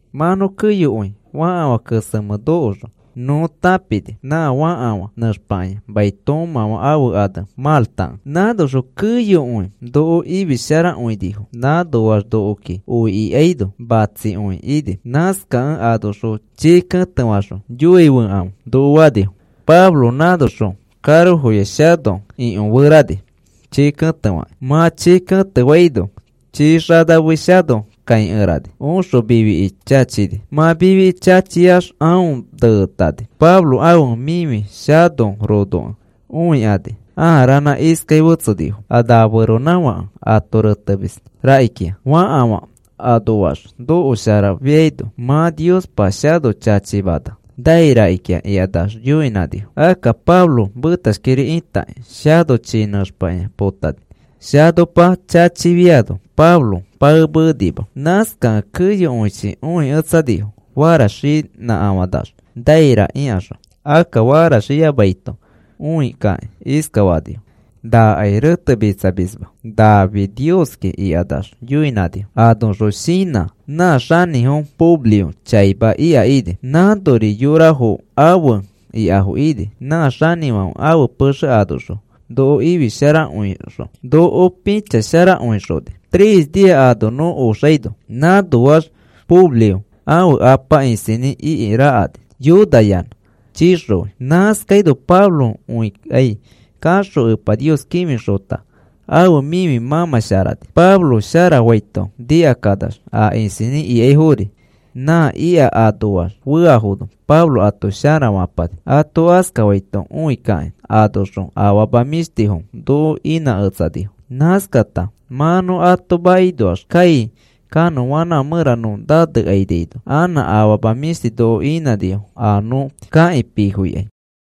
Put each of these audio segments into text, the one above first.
Mã nõ keyokõi fãkafã kesemẽ nokoxõ, nõ tãpini nã fãkafã nẽxpakĩa mai toomãfã ãfe ane Maltakẽ. Nãnoxõ keyokõi noko ifisharakõinifo. Nãnoax nokoki oi ikaino, matsikõi ini. Nãskakẽ anoxõ chii ketefakaxõ, “Yoofẽkãfe,” noko fanifo. Pablo nãnoxõ karoya shano ikõferani chii ketefakĩ. Mã chii ketefaino chii xanamei shano kãikerani oxõ mifiki chachini. Mã mifiki chachiax aõ neetani. Pablo ãfe mifi shano ronokẽ õikani ãa ranã iskai fetsenifo: “A na feronãfãke ato retemis rakikĩa. Fakafã anoax nokosharafiaino, mã Niospa shano chachimana nai rakikĩa,” ikanax yoinãnifo. Akka Pablo metashkiri itakĩ shano chii nẽxpakĩa potani. Shanopa chachifiano Pablo paemenima. Nãskakẽ keyokõichi õiketsanifo faraxinãkafanax naira ikaxõ. Akka faraxiyamaito õikakĩ, iskafanifo: “Nakai retemitsamisma, nafi nioski,” ikanax yoinãnifo. Anoxõ shinã nã xanĩfo Publio chaima ika ini. Nãnori yorafo afe ikafo ini. Nã xanĩfãfe ãfe pexe anoxõ noko ifisharakõixõ noko pĩchasharakõixoni, tres nia ano nõ oxaino. Nãnoax Publio ãfe apa isinĩ iki rakani, yonayanã chixoi. Nãskaino Pablo õikai kaxõ Epa Nios kĩfixota ãfe mĩfi mãmãsharani. Pablo sharafaito nikakanax a isinĩ ikaifori nã ika anoax feafono Pablo ato sharafapani. Ato askafaito õi kakĩ anoxõ afama mĩshtifo noko inãketsanifo. Nãskata mã nõ ato makinoax kai kanõanãfã mẽra nõ naneikainaino, anã afama mĩshtifo noko inãnifo a nõ kakĩ pifoikai.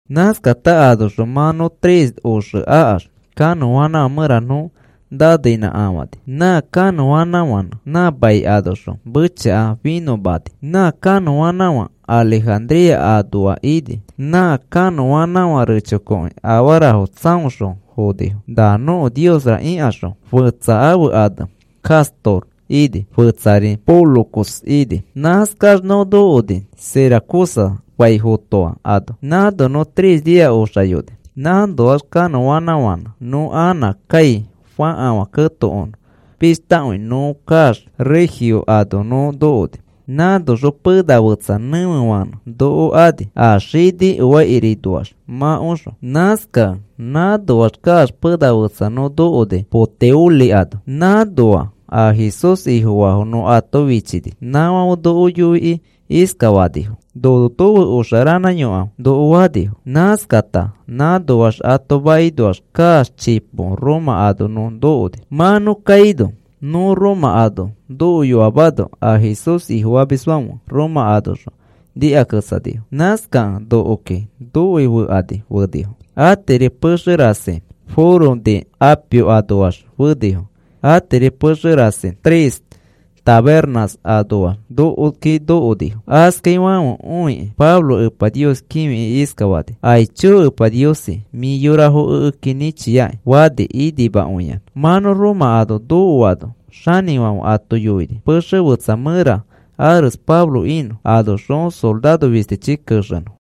Nãskata anoxõ mã nõ tres oxe akax, kanõanãfã mẽra nõ naneinãkafãni. Nã kanõanãfãnẽ nã mai anoxõ mechaka finõmani. Nã kanõanãfã Alejandría anoa ini. Nã kanõanãfã recho koki afarafo tsaoxõ fonifo na nõko niosra ikaxõ, fetsa ãfe ane Castor ini, fetsari Pólux ini. Nãskax nõ nokoni Siracusa fai fotoa ano, nãno nõ tres nia oxayoni. Nãnoax kanõanãfãnẽ nõ anã kai fakafã ketokonõ pishtakõi nõ kaax Regio ano nõ nokoni. Nãnoxõ pena fetsa nẽfefãnẽ noko ani a xini oaikirinoaxma oxõ. Nãskakẽ nãnoax kaax pena fetsa nõ nokoni Puteoli ano. Nãnoa a Jesús Ifofaafo nõ ato fichini nãfãfe noko yoikĩ iskafanifo: “Nono nofe oxa ranãyokãfe,” noko fanifo. Nãskata nãnoax ato makinoax kaax chipo Roma ano nõ nokoni. Mã nõ kaino nõ Roma ano nokoyoamano a Jesús Ifofamisfãfe Roma anoxõ nikaketsanifo. Nãskakẽ nokoki nokoifekani fenifo. Atiri pexe rasi Foro de Apio anoax fenifo, atiri pexe rasi Tres Tabernas anoax nokoki nokonifo. Askaifãfe õikĩ Pablo Epa Nios kĩfikĩ iskafani: “Aicho Epa Niosi, mĩ yorafo ekeki nĩchiaki,” fani inimakõiyanã. Mã nõ Roma ano nokoano, xanĩfãfe ato yoini pexe fetsa mẽra ares Pablo inõ, anoxõ soraro fistichi kexenõ.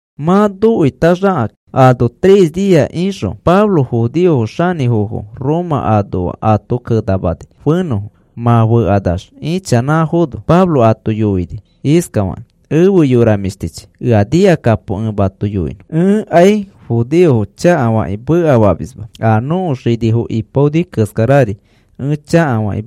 Mã nokoitaxakakĩ ano tres nia ixõ, Pablo judeofo xanĩfofo Roma anoa ato kenamani fenõfo. Mã fekanax ichanãfono Pablo ato yoini iskafakĩ: “Efe yora mĩshtichi, ea nikakapo ẽ mato yoinõ. Ẽkai judeofo chakafakĩ mekafamisma. A nõko xinifo ipaonifo keskarari ẽ chakafakĩ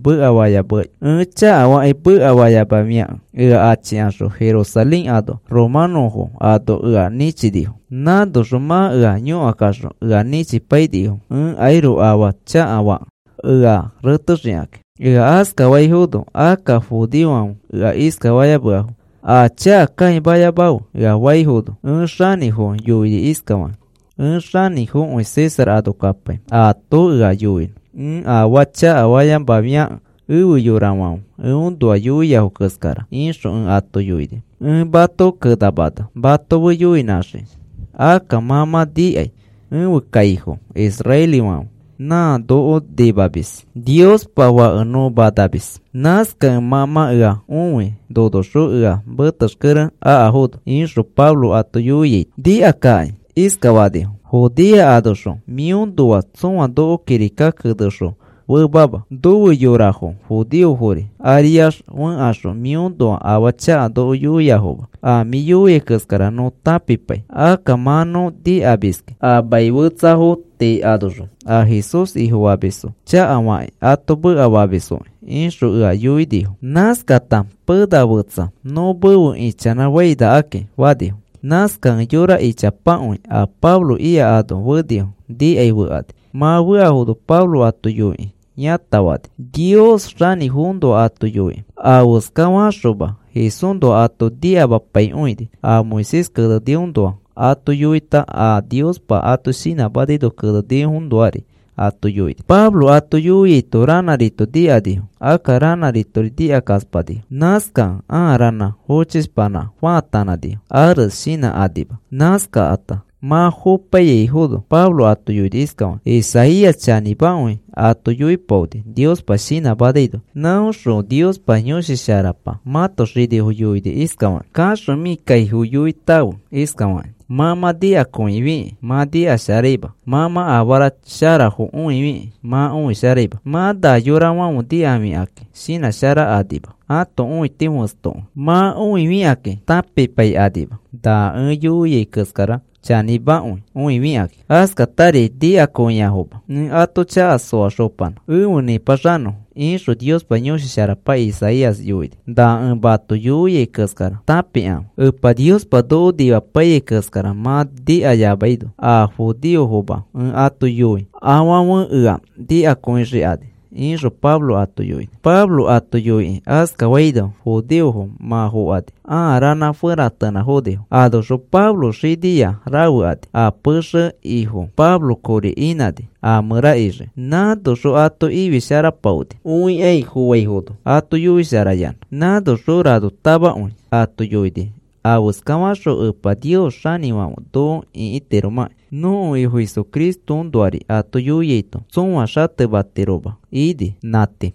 mekafayamafiakẽ, ea achikaxõ Jerusalén anoxõ romanõfo ano ea nĩchinifo. Nãnoxõ mã ea yõkakaxõ, ea nĩchipainifo, ẽkairoko afaa chakafakẽ ea retexikakĩ. Ea askafaifono, akka judeofãfe ea iskafayameafo: ‘A chaka kãimayamafe,’ ea faifono, ẽ xanĩfofo yoini iskafakĩ: ‘Ẽ xanĩfokõi César ano kapai ato ea yoinõ, ẽ afaa chakafayamafiakẽ efe yorafãfe eõnoa yoiafo keskara,’ ixõ ẽ ato yoini. Ẽ mato kenamana mato fe yoinãxiki. Akka mã mã nikai ẽfe kaifo israelifãfe, nã noko nimamis Niospa Fake nõ manamis. Nãskakẽ mã mã ea õi nonoxõ ea metexkere akafono,” ixõ Pablo ato yoiaito, nikakakĩ iskafanifo: “Judea anoxõ mĩõnoa tsõa noko kirika kenexõ femama. Nofe yorafo judeofori ariax fẽkaxõ mĩõnoa afaa chaka noko yoiafoma. A mĩ yoiai keskara nõ tãpipai, akka mã nõ nikamiski, a maniafo tii anoxõ a Jesús Ifofamisfo chakafakĩ ato mekafamisfokĩ,” ixõ ea yoinifo. Nãskakata, “Pena fetsa nõ mefe ichanãfainakaki,” fanifo. Nãskakẽ yora ichapakõi a Pablo ika ano fenifo nikai fekani. Mã feafono Pablo ato yoikĩ yãtafani, Nios xanĩfoõnoa ato yoikĩ. Afeska faxoma Jesúsnoa ato nikamapaikõini, a Moisés keneniõnoa ato yoita, a Niospa ato shinãmanaino kenenifoõnoari ato yoini. Pablo ato yoiaito ranãrito nikanifo, akka ranãritori nikakaspanifo. Nãskakẽ ãa ranã fochishpanã faatanãnifo ares shinãkanima. Nãskakata mã fopaiyaifono Pablo ato yoini iskafakĩ: “Isaías chanĩmakõi ato yoipaoni Niospa shinãmanaino. Nãõxõ Niospa Yõshi Sharapa mãto xinifo yoini, iskafakĩ: Kaxõ mĩ kaifo yoitãfe iskafakĩ: ‘Mã mã nikakõifikĩ mã nikasharaima; mã mã afara sharafo õifikĩ mã õisharaima.’ Mã na yorafãfe nikafikakĩ shinãsharakanima, ãto õiti fẽstokõi. Mã õifikakĩ tãpipaikanima, na ẽ yoiai keskara chanĩmakõi õifikakĩ. Askatari nikakõiafoma ẽ ato chaka soaxopanã efe nĩpaxanõfo, ixõ Niospa Yõshi Sharapa Isaías yoini. Na ẽ mato yoiai keskara tãpikãfe, Epa Niospa noko nimapaiyai keskara mã nikayamaino a judeofoma ẽ ato yoi afãfe ea nikakõixikani,” ixõ Pablo ato yoini. Pablo ato yoikĩ askafaino, judeofo mã fokani ãa ranã feratenãfonifo. Anoxõ Pablo xiniya rafe ani. A pexe ifo Pablo kori inãni a mẽra ixiki. Nãnoxõ ato ifisharapaoni õikai fofaifono ato yoisharayanã. Nãnoxõ ranotamakõi ato yoini afeskaxõ Epa Nios xanĩfãfe noko ĩkitiromãki. Nõko Ifo Jesucristoõnoari ato yoiaito tsõa xatematiroma ini. Nã tii.